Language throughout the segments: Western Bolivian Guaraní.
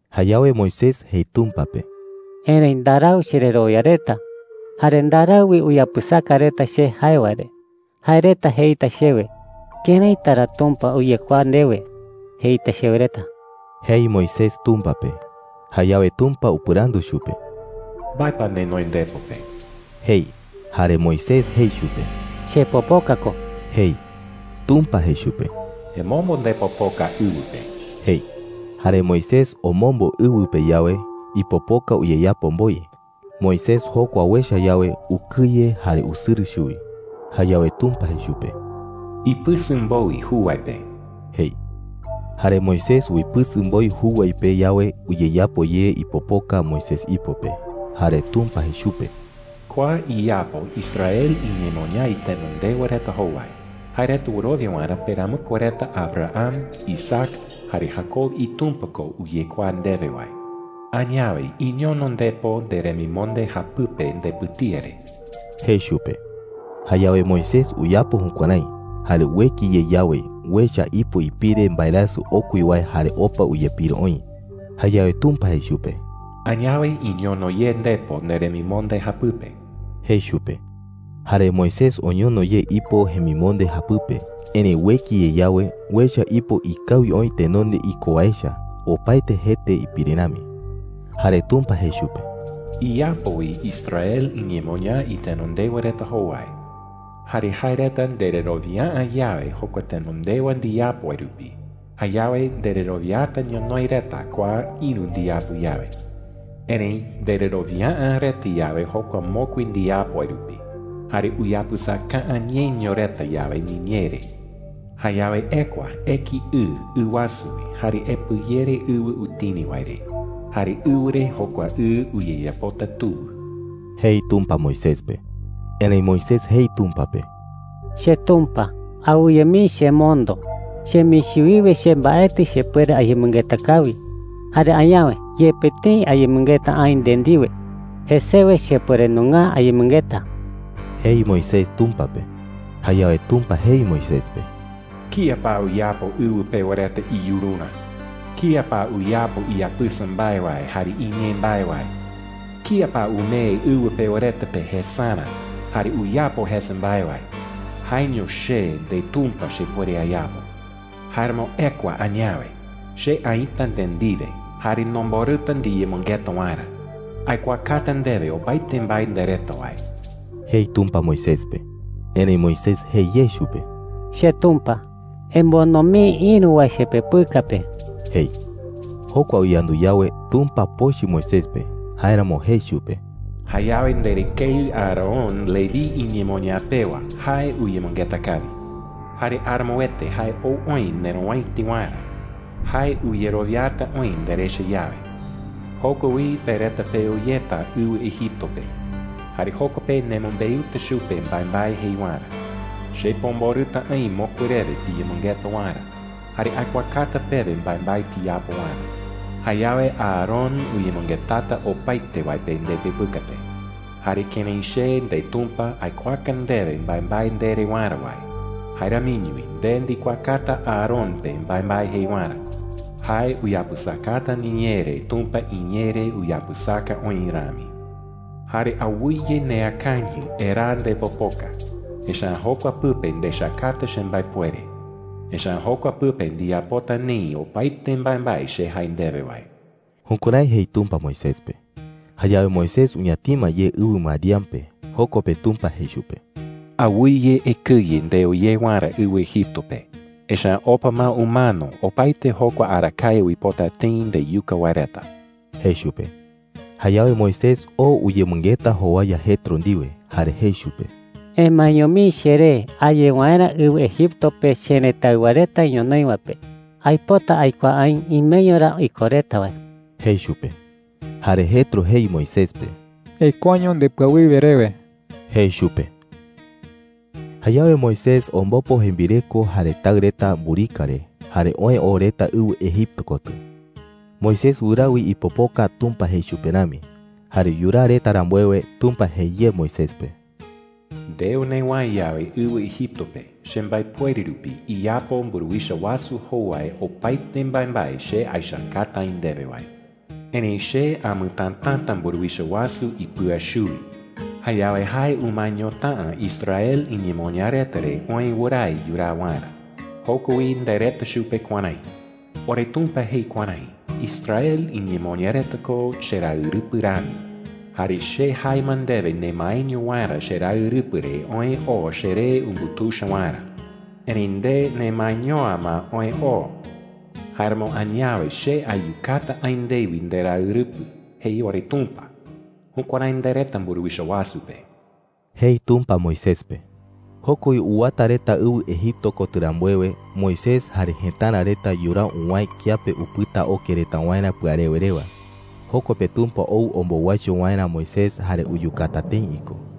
Jayawe Moisés jei Tumpa pe: “Erëi ndarau chererowia reta. Jare ndarau wi uyapɨsaka reta che jae wae re. Jae reta jeita chewe: “¿Këraita ra Tumpa uyekuaa ndewe?’ jeita chewe reta,” jei Moisés Tumpa pe. Jayawe Tumpa upɨrandu chupe: “¿Mbae pa nenoi ndepo pe?” jei. Jare Moisés jei chupe: “Chepopoka ko,” jei. Tumpa jei chupe: “Emombo ndepopoka ɨwɨ pe,” jei. Jare Moisés omombo ɨwɨ pe yawe, ipopoka uyeyapo mboi. Moisés jokua uecha yawe, ukɨye jare usɨrɨ chuwi. Jayawe Tumpa jei chupe: “Ipɨsɨ mboi juwai pe,” jei. Jare Moisés uipɨsɨ mboi juwai pe yawe, uyeyapo ye ipopoka Moisés ipo pe. Jare Tumpa jei chupe: “Kua iyapo Israel iñemoñaa itenondewa reta jowai, jae reta wɨrowia waerä peramɨkue reta Abraham, Isaac, jare Jacob iTumpa ko uyekuaa ndewe wae,” jei. “Añawe iñono ndepo neremimonde japɨpe ndepɨtía re,” jei chupe. Jayawe Moisés uyapo jukuärái, jare ueki ye yawe, uecha ipo ipire mbaerasɨ okui wae jare opa uyepiro oï. Jayawe Tumpa jei chupe: “Añawe iñono ye ndepo neremimonde japɨpe,” jei chupe. Jare Moisés oñono ye ipo jemimonde japɨpe. Erëi ueki ye yawe, uecha ipo ikawi oï tenonde iko wae echa, opaete jete ipire rami. Jare Tumpa jei chupe: “Iyapo wi Israel iñemoñaa itenondewa reta jowai. Jare jae reta ndererowia’ä yawe jokua tenondewa ndiyapo wae rupi, jayawe ndererowiata ñonoï reta kua ïru ndiyapo yawe,” jei. “Erëi ndererowia’ä reta yawe jokua mokui ndiyapo wae rupi, jare uyapɨsaka’ä ñeño reta yawe niñee re, jayawe ekua eki ɨ ɨ wasu wi jare epɨyere ɨwɨ utini wae re. Jare ɨwɨ re jokua ɨ uyeyapota tuwɨ,” jei Tumpa Moisés pe. Erëi Moisés jei Tumpa pe: “CheTumpa, awɨye mii chemondo. Chemichi wiwe che mbaetɨ chepuere ayemɨngeta kawi. Jare añawe, yepe tëi ayemɨngeta aï nde ndiwe, jesewe chepuere nunga’ä ayemɨngeta,” jei Moisés Tumpa pe. Jayawe Tumpa jei Moisés pe: “¿Kía pa uyapo ɨwɨ pewa reta iyururä? ¿Kía pa uyapo iyapɨsa mbae wae jare iñee mbae wae? ¿Kía pa umee ɨwɨ pewa reta pe jesarä jare uyapo jesa mbae wae? Jaeño che, ndeTumpa, chepuere ayapo,” jei chupe. “¡Jáeramo ekua añawe! Che aïta nde ndiwe jare nomborɨta ndiyemɨngeta waerä. Aikuaakata ndewe opaete mbae ndereta wae,” jei Tumpa Moisés pe. Erëi Moisés jei ye chupe: “CheTumpa, emondo mii ïru wae chepepɨka pe,” jei. Jokua uyandu yawe, Tumpa pochɨ Moisés pe. Jáeramo jei chupe: “Jayawe nderɨkeɨ Aarón, Leví iñemoñaa pewa, jae uyemɨngeta kawi,” jei. “Jare aramoete jae ou oï nerowäiti waerä. Jae uyerowiata oï nderecha yawe,” jei. “Joko wi pe reta peo yeta ɨwɨ Egipto pe, jare joko pe nemɨmbeuta chupe mbaembae jei waerä. Che pomborɨta aï mokui rewe piyemɨngeta waerä, jare aikuaakata pewe mbaembae piyapo waerä,” jei chupe. “Jayawe Aarón uyemɨngetata opaete wae pe ndepepɨka pe. Jare kërái che, ndeTumpa, aikuaaka ndewe mbaembae ndere waerä wae, jae ramiño wi nde ndikuaakata Aarón pe mbaembae jei waerä. Jae uyapɨsakata niñee re Tumpa iñee re uyapɨsaka oï rami,” jei. “Jare awɨye neakañɨ eraa ndepopoka, echa’ä jokua pɨpe ndechakata chembaepuere. Echa’ä jokua pɨpe ndiyapota neï opaete mbaembae che jae ndewe wae.” Jukuärái jei Tumpa Moisés pe. Jayawe Moisés uñatima ye ɨwɨ Madián pe. Joko pe Tumpa jei chupe: “Awɨye ekɨye ndeo ye waerä ɨwɨ Egipto pe, echa’ä opa ma umano opaete jokua arakae uipota tëi ndeyuka wae reta,” jei chupe. Jayawe Moisés oo uyemɨngeta jowaya Jetro ndiwe, jare jei chupe: “Emaeño mii cheré a ye waerä ɨwɨ Egipto pe cherëtáɨwa reta ñonoï wae pe. Aipota aikuaa aï imeño ra iko reta wae,” jei chupe. Jare Jetro jei Moisés pe: “Ekuaño ndepɨawiwe rewe,” jei chupe. Jayawe Moisés ombopo jembireko jare taɨ reta mburika re, jare oë oo reta ɨwɨ Egipto kotɨ. Moisés wɨraa wi ipopoka Tumpa jei chupe rami. Jare yuraa reta rambuewe, Tumpa jei ye Moisés pe: “Ndeo newäe yawe ɨwɨ Egipto pe, chembaepuere rupi iyapo mburuwicha wasu jowai opaete mbaembae che aechakata aï ndewe wae,” jei. “Erëi che amɨtätata mburuwicha wasu ipɨa chuwi. Jayawe jae umaeñota’ä Israel iñemoñaa reta re oë wɨrae yuraa waerä,” jei. “Joko wi ndereta chupe kuärái: ‘OreTumpa jei kuärái: ‘Israel iñemoñaa reta ko cheraɨrɨpɨ rami. Jare che jae ma ndewe nemaeño waerä cheraɨrɨpɨ re oë oo cheree umbutuicha waerä. Erëi nde nemaeño’ä ma oë oo. Jáeramo añawe che ayukata aï ndewi nderaɨrɨpɨ,’ jei oreTumpa.’ Jukuärái ndereta mburuwicha wasu pe,” jei Tumpa Moisés pe. Joko wi uwata reta ɨwɨ Egipto kotɨ rambuewe, Moisés jare jëtara reta yuraa uwäe kiape upɨta oke reta waerä pɨarewe rewa. Joko pe Tumpa ou ombowaicho waerä Moisés jare uyukata tëi iko.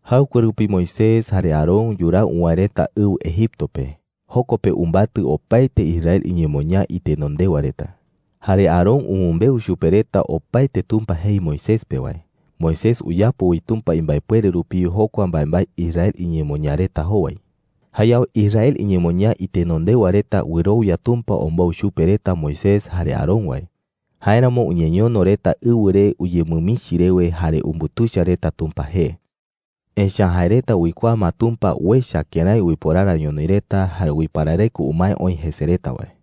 Jaɨkue rupi Moisés jare Aarón yuraa uwäe reta ɨwɨ Egipto pe. Joko pe umbatɨ opaete Israel iñemoñaa itenondewa reta. Jare Aarón umɨmbeu chupe reta opaete Tumpa jei Moisés pe wae. Moisés uyapo wi Tumpa imbaepuere rupi jokua mbaembae Israel iñemoñaa reta jowai. Jayawe Israel iñemoñaa itenondewa reta wɨrowia Tumpa ombou chupe reta Moisés jare Aarón wae. Jáeramo uñeñono reta ɨwɨ re uñemɨmichi rewe jare umbutuicha reta Tumpa jee. Echa’ä jae reta uikuaa ma Tumpa uecha kërái uiporara ñonoï reta jare uiparareko umae oï jese reta wae.